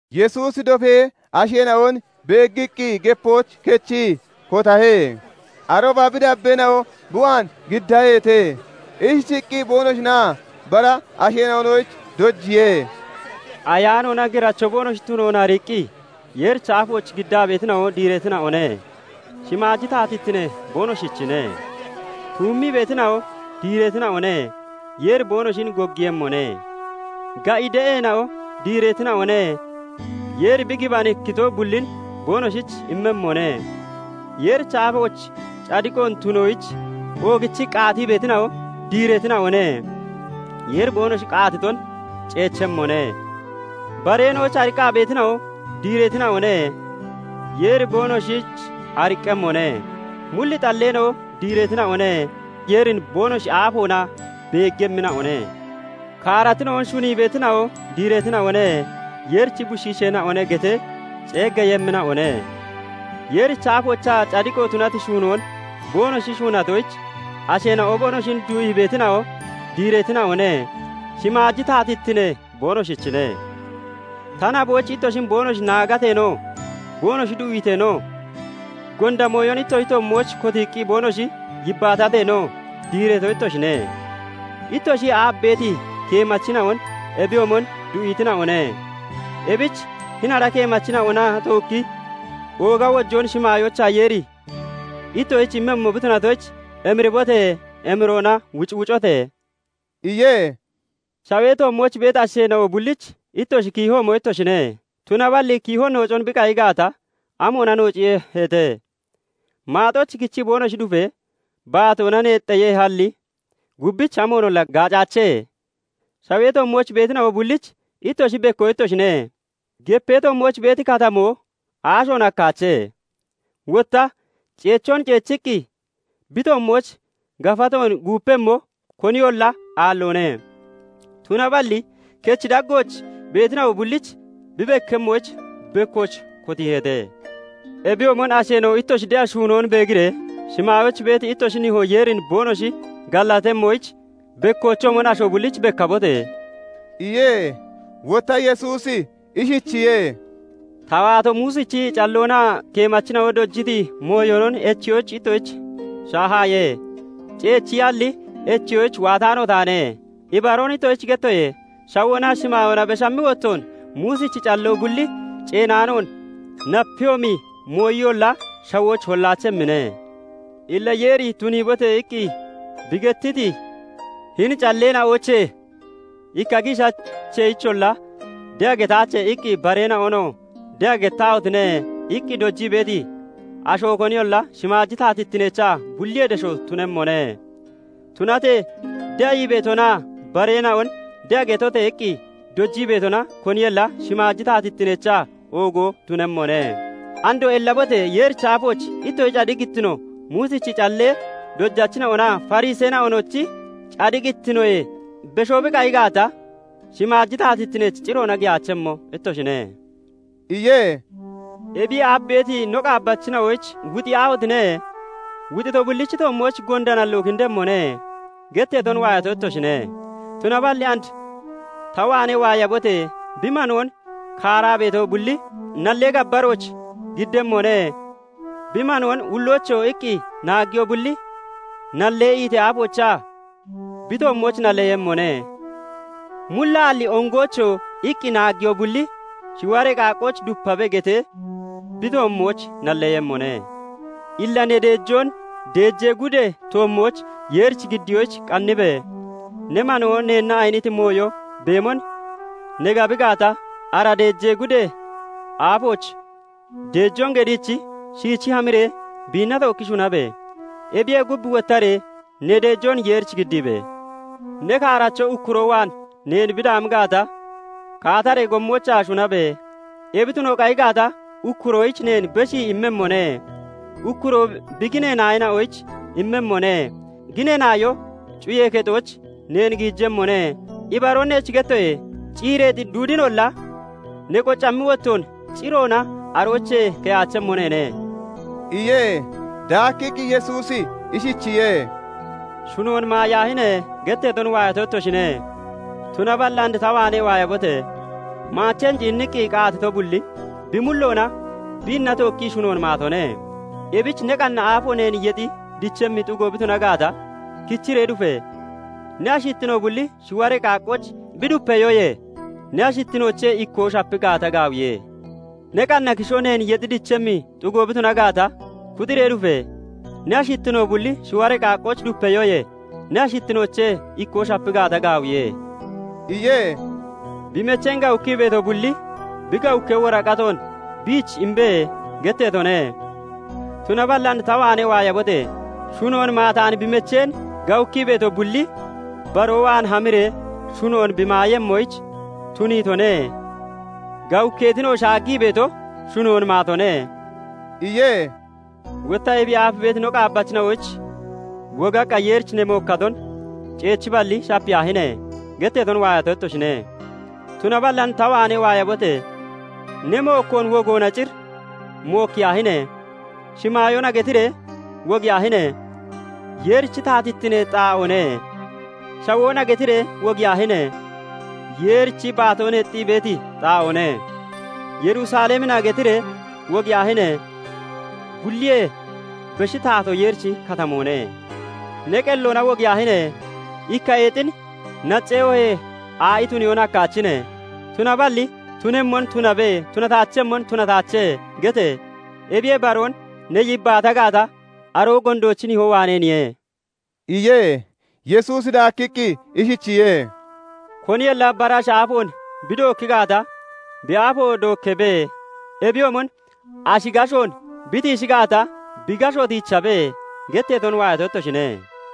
Yesuusi dofee asheena'on beeggiqqi gepooch kechii kotahe. Arooba bi dabbeena'o bi waan giddaheete. Ishichiqqi boonoshinaa bara asheena'onoyich dojiye. "Ayaanoona giracho boonoshi tunoon ariiqqi, Yeerichi aafooch giddaa beetina'o diireetina'one; Shimaaji taatittinee boonoshichine. "Tuummii beetina'o diireetina'one; Yeeri boonoshin goggiiyemmone. "Ga'i de'eena'o diireetina'one; Yeeri bi gibanikkito bullin boonoshich immemmone. "Yeerichi aafooch cadiqoon tunoyich, oogichii qaatii beetina'o diireetina'one; Yeeri boonoshi qaatiton ceechemmone. "Bareena'oyich ariqqaa beetina'o diireetina'one; Yeeri boonoshich ariqqemmone. "Mulli xalleena'o diireetina'one; Yeerin boonoshi aafoona beeggemmina'one. Kaaratina'on shunii beetina'o diireetina'one; 'Yeerichi Bushiisheena'one' getee ceeggeeyemmina'one. "Yeerichi aafooch cadiqo tunati shuunoon boonoshi shuunatoyich Asheena'o boonoshin du'ii beetina'o diireetina'one; Shimaaji taatittine boonoshichine. "Ta naboyich ittoshin boonoshi naagateenoo, boonoshi du'iiteenoo, gonda mooyon ittoshi toommooch koottiqqi boonoshi yibbaatateenoo diireeto ittoshine. Ittoshiyee aaf beeti keemachina'on ebiyoomon du'iitina'one. Ebich hini ara keemachina'ona tookkii ooga wojoon shimaayoochaa Yeeri ittoshich immemmo bi tunatoyich, emiribote! Emiroona wucwucote!" iye. "Shawee toommooch beeti asheena'o bullich ittoshi kiihoomo ittoshine. Tunaballi kiiho noocon bi qayi gaata, amoona noociiyeheete? Maaxooch kichi boonoshi dufee, baatoona neexxeeyehalli, gubbich amoonolla gaacaache. "Shawee toommooch beetina'o bullich ittoshi bekko ittoshine. Gepee toommooch beeti Katamoo aashoon hakkaache. Wotta ceechoon ceechiqqi bi toommooch gafatoon guupemmo koniyolla aalloone; tunaballi kechi daggooch beetina'o bullich bi bekkemmoyich, bekkooch kotiiheete. Ebiyoomon asheena'o ittoshi de'a shuunoon beegiree shimaayooch beeti ittoshi Nihoo Yeerin boonoshi gallatemmoyich, bekkoochoomon asho bullich bekkabote!" iye. Wotta Yesuusi ishcichiye:- "Ta waato Muusichi calloonaa keemachina'o dojiti mooyonon echiyoyich ittoshich shaahaaye; ceechiyalli echiyoyich waataano taane. Ibaroon ittoshich gettoye; shawoonaa shimaayoona beshammi wottoon Muusichi calloo bulli ceenaanoon napeyoomi mooyiyolla shawooch hollaachemmine. Illa Yeeri 'Tuniibote!' iqqi bi gettiti hini calleena'oochee ikka giishacheeyicholla 'De'a getaache' iqqi bareena'onoo 'De'a gettaahotine!' iqqi dojii beeti asho koniyolla shimaaji taatittineechaa bulliyee desho tunemmone; tunatee de'a ii beetonaa bareena'on 'De'a getote!' iqqi dojii beetona koniyolla shimaaji taatittineechaa oogo tunammone. Andoo ellabote! Yeerichi aafooch ittoshi cadiqittino Muusichi callee dojachina'onaa Fariseena'onochi cadiqittinoyee beshoo bi qayi gaata, shimaaji taatittineech ciroona giyaachemmo ittoshine" iye. "Ebiyee aaf beeti no qaabbachina'oyich 'Wuxiyaahotine! Wuxito bullichi toommooch gonda nalloo kindemmone' getteeton waayato ittoshine. Tunaballi and ta waanee waayabote! Bi manoon kaaraa beeto bulli nallee gabbarooch giddemmone; bi manoon 'Ulloocho!' iqqi naaggiyo bulli nallee iitee aafoochaa bi toommooch nalleyemmone; 'Mullaalli ongoocho!' iqqi naaggiyo bulli 'Shiwaree qaaqqooch dupabe' getee bi toommooch nalleeyemmone. "Illa ne deejoon deejee gudee toommooch Yeerich giddiyoyich qanniibee, ne manoo neenna ayiniti mooyo beemon ne gabi gaata, ara deejee gudee aafooch deejoon geddiichi shiichi hamiree biinna tookki shunabe! Ebiyee gub wottaree ne deejoon Yeerich giddiibe! "Ne kaaracho ukkuroo waan neen bi daami gaata, kaataree gommoochaa shunabe! Ebi tuno qayi gaata, ukkuroyich neen beshii immemmone; ukkuroo bi ginee naayoyich immemmone; ginee naayoo cuyee kexooch neen giijemmone. Ibaroon neech gettoye; ciireexi duudinolla ne qocammi wottoon ciroona aroochee keyaachemmo neene" iye. Daakkiqqi Yesuusi ishichiye:- " 'Shunoon maayaahine!' getteeton waayato ittoshine. Tunaballi and ta waanee waayabote! Maacheen ciinniqqi qaatito bulli bi mulloona biinna tookkii shunoon maatone. Ebich ne qanna aafo neen yexi dichemmi xugo bi tuna gaata, kichiree dufe! Ne ashittino bulli shiwaree qaaqqooch bi dupeyoyee ne ashittinoochee ikkoo shapi gaata gaawiye. Ne qanna kisho neen yexi dichemmi xugo bi tuna gaata, kuxiree dufe! Ne ashittino bulli shiwaree qaaqqooch dupeyoyee ne ashittinoochee ikkoo shapi gaata gaawiye" iye. " 'Bi mecheen gawukkii beeto bulli bi gawukkee woraqatoon biich imbe' getteetone. Tunaballi and ta waanee waayabote! Shunoon maataani bi mecheen gawukkii beeto bulli baroo waan hamiree shunoon bi maayemmoyich tuniitone; gawukkeetinoo shaaggii beeto shunoon maatone" iye. "Wotta ebiyee aaf beeti no qaabbachina'oyich 'Wogaqqa Yeerich ne mookkaton ceechiballi shapiyaahine!' getteeton waayato ittoshine. Tunaballi and ta waanee waayabote! Ne mookkoon wogoona cir mookkiyaahine! 'Shimaayoona!' getiree wogiyaahine! Yeerichi taatittinee xaa'oone. 'Shawoona!' getiree wogiyaahine! Yeerichi baatoo neexxii beeti xaa'oone. 'Yerusalemina!' getiree wogiyaahine! Bulliyee beshi taatoo Yeerichi katamoone. Ne qelloona wogiyaahine! Ikka eexin naccee oohee aa'i tuniyoon hakkaachine. Tunaballi tunemmon 'Tunabe' tunataachemmon 'Tunataache' gete! Ebiyee baroon ne yibbaata gaata, aroo gondoochi nihoo waaneeniye" iye. Yesuusi daakkiqqi ishichiye:- " 'Koniyolla bara ashi aafoon bi dookki gaata, bi aafo dookkeebe; ebiyoomon ashi gashoon bi tiishi gaat, bi gasho tiichabe' getteeton waayato ittoshine.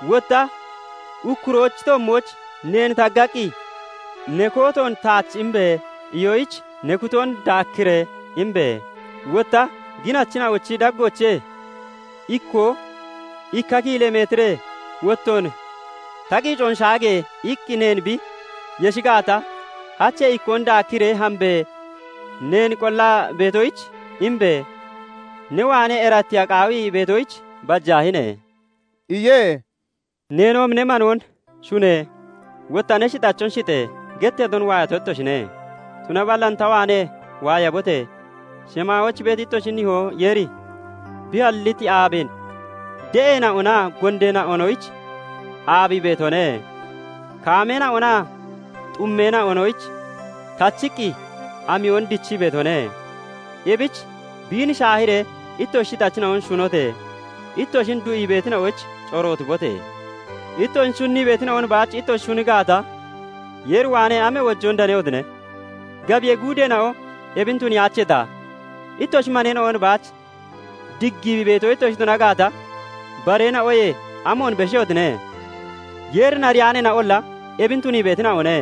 Wotta ukkuroochi toommooch neen taggaqqi, 'Ne kootoon taach imbe!' iyoyich ne kutoon daakkiree imbe! Wotta ginachina'ochi daggoochee ikkoo 'Ikka kiilee metiree wottoon ta qiicoon shaage!' iqqi neen bi yeshi gaata, hachee ikkoon daakkiree hambe! Neen qollaa beetoyich imbe! ne waanee erattiya qaawii beetoyich bajaahine!" iye. " 'Neenoomi ne manoon shune! Wotta ne shixachon shixe!' getteeton waayato ittoshine. Tunaballi and ta waanee waayabote! Shimaayooch beeti ittoshi nihoo Yeeri bi halliti aabeen de'eena'onaa gondeena'onoyich aabii beetone; kaameena'onaa xummeena'onoyich tachiqqi amiyon dichii beetone. Ebich biin shaahiree ittoshi shixachina'on shunote! Ittoshin du'ii beetina'oyich corootibote! Ittoshin shunnii beetina'on baach ittoshi shuni gaata, Yeeri waanee amee wojoon danehotine? Gabiyee guudeena'o ebin tuniyaacheeta? Ittoshi maneena'on baach diggii beeto ittoshi tuna gaata, bareena'oyee amoona beshehotine? Yeerin ariyaaneena'olla ebin tunii beetina'one.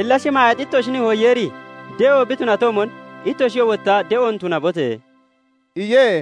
Illa shamaayeexi ittoshi nihoo Yeeri de'o bi tunatoomon, ittoshiyoo wotta de'oon tunabote!" iye.